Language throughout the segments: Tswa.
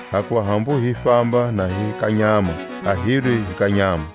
Hakuva hambu hi famba na hi ka nyama a hilwi hi ka nyama.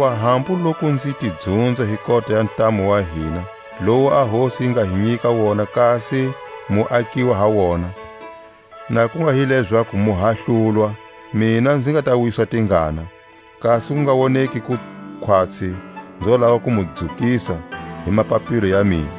Hakuva hambu loku nzi ti dzunza hi kota ya ntamu wa hina, lowu a Hosi yi nga hi nyika wona kasi mu akiwa ha wona, na ku nga hi lezaku mu hahlulwa, mina nzi nga ta wiswa tingana; kasi ku nga woneki ku khwatsi nzo lava ku mu dzukisa hi mapapilo ya mina.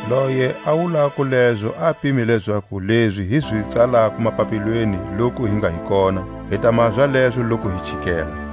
Loye a wulako lezo a pime lezaku lezi hi zi tsalako mapapilweni loku hi nga hi kona, hi ta maha zalezo loku hi chikela.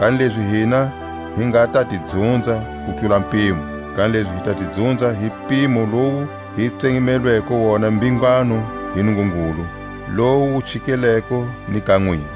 Kanilezi hina hi nga ta ti dzunza ku tlula mpimo, kanilezi hi ta ti dzunza hi mpimo lowu hi tsemelweko wona mbhingano hi Nungungulu, lowu wu chikeleko ni ka nwina.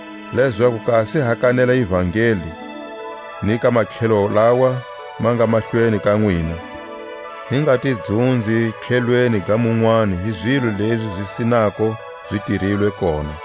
Lezaku kasi ha kanela ivangeli ni ka matlhelo lawa ma nga mahlweni ka nwina, hi nga ti dzunzi tlhelweni ga munwani hi zilo lezi zi sinako zi tirilwe kona.